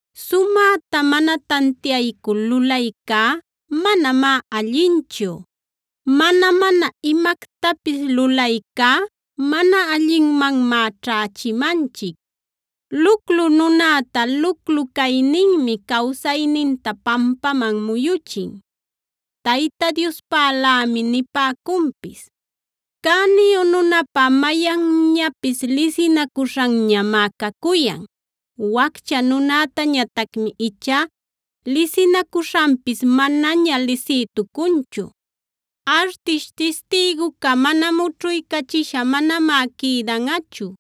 Sumäta mana tantiaycul lulaycá manamá allinchu; mana-mana imactapis lulaycá mana allinmanmá ćhächimanchic. Luclu nunäta luclu cayninmi cawsayninta pampaman muyuchin, Tayta Diospälämi piñacunpis. Cäniyu nunäpa mayanñapis lisinacuśhanñamá cacuyan; waccha nunätañatacmi ichá lisinacuśhanpis manaña lisïtucunchu. Artish tistïguca mućhuycachisha manamá quïdanꞌachu;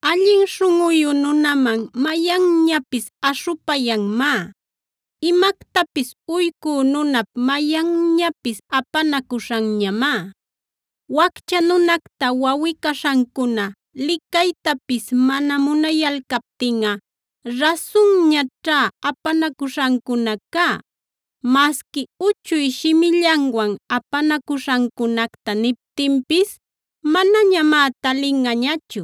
Allin śhunꞌuyu nunaman mayanñapis aśhupayanmá; imactapis uycü nunap mayanñapis apanacuśhanñamá. Waccha nunacta wawꞌi-caśhancuna licaytapis mana munayalcaptinꞌa, rasunñaćhá apanacuśhancunacá. Masqui uchuy shimillanwan apanacuśhancunacta niptinpis manañamá talinꞌañachu.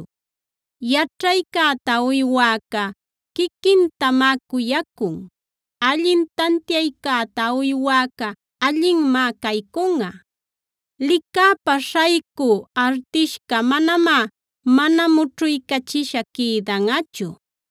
Yaćhaycäta uywäca quiquintamá cuyacun; allin tantiaycäta uywäca allinmá caycunꞌa. Licäpa śhaycü artishca manamá mana mućhuycachisha quïdanꞌachu;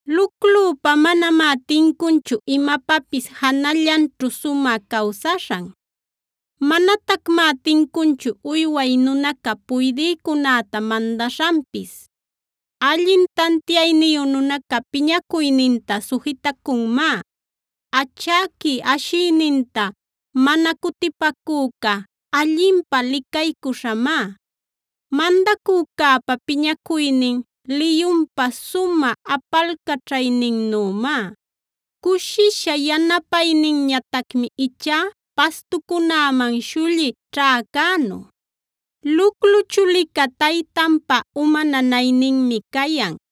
Luclüpa manamá tincunchu imapapis janallanćhu sumä cawsaśhan; manatacmá tincunchu uyway nunaca puydïcunäta mandaśhanpis. Allin tantiayniyu nunaca piñacuyninta sujitacunmá; achäqui ashïninta mana cutipacüca allinpä licaycuśhamá. Mandacücäpa piñacuynin liyunpa sumä apalcaćhayninnümá; cushisha yanapayninñatacmi ichá pastucunäman śhulli ćhäcänu. Luclu chulica taytanpa uma nanayninmi cayan.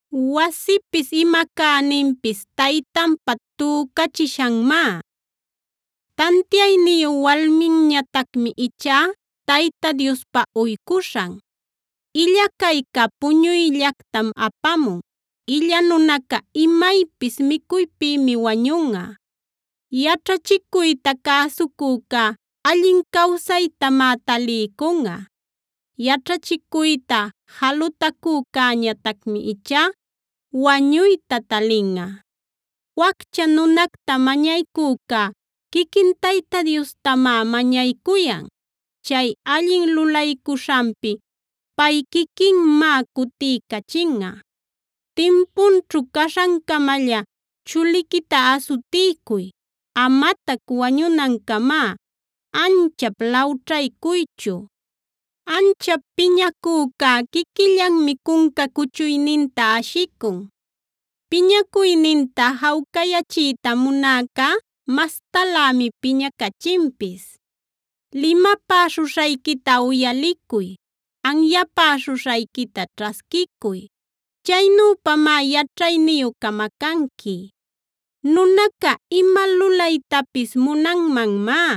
Wasipis, ima cäninpis taytanpa tücachishanmá. Tantiayniyu walminñatacmi ichá Tayta Diospa uycuśhan. Illa cayca puñuyllactam apamun; illa nunaca imaypis micuypïmi wañunꞌa. Yaćhachicuyta cäsucücá allin cawsaytamá taliycunꞌa; yaćhachicuyta jalutacücäñatacmi ichá wañuyta talinꞌa. Waccha nunacta mañaycücá, quiquin Tayta Diostamá mañaycuyan; chay allin lulaycuśhanpi pay quiquinmá cutiycachinꞌa. Timpunćhu caśhancamalla chuliquita asutiycuy; amatac wañunancamá anchap lawćhaycuychu. Anchap piñacücá quiquillanmi cunca cuchuyninta ashicun; piñacuyninta jawcayachiyta munäcá mastalämi piñacachinpis. Limapäśhuśhayquita uyalicuy, anyapäśhuśhayquita ćhasquicuy; chaynüpamá yaćhayniyu camacanqui. Nunaca ima lulaytapis munanmanmá;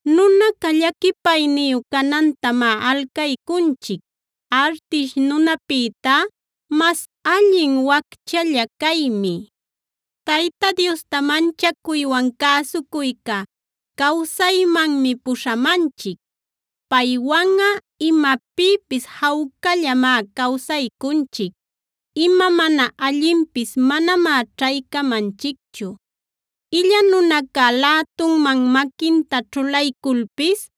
Nunaca llaquipayniyu canantamá alcaycunchic; artish nunapïtá mas allin wacchalla caymi. Tayta Diosta manchacuywan cäsucuyca cawsaymanmi puśhamanchic; paywanꞌa imapïpis jawcallamá cawsaycunchic, ima mana allinpis manamá ćhaycamanchicchu. Illa nunaca lätunman maquinta ćhulayculpis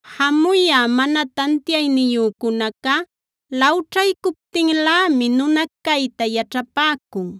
Jamuyä mana tantiayniyücunaca lawćhaycuptinlämi nuna cayta yaćhapäcun;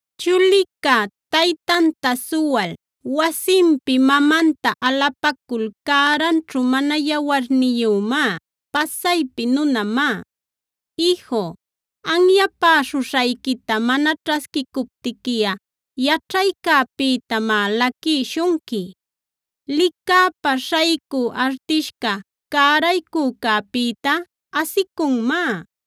Chulica, taytanta suwal, wasinpi mamanta alapacul cäranćhu mana yawarniyümá, pasaypi nunamá. Iju, anyapäśhuśhayquita mana ćhasquicuptiquiꞌa yaćhaycäpïtamá laquïshunqui. Licäpa śhaycü artishca cäraycücäpïta asicunmá;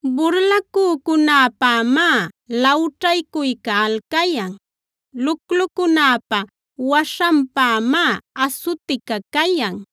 Burlacücunäpämá lawćhaycuyca alcayan; luclucunäpa waśhanpämá asutica cayan.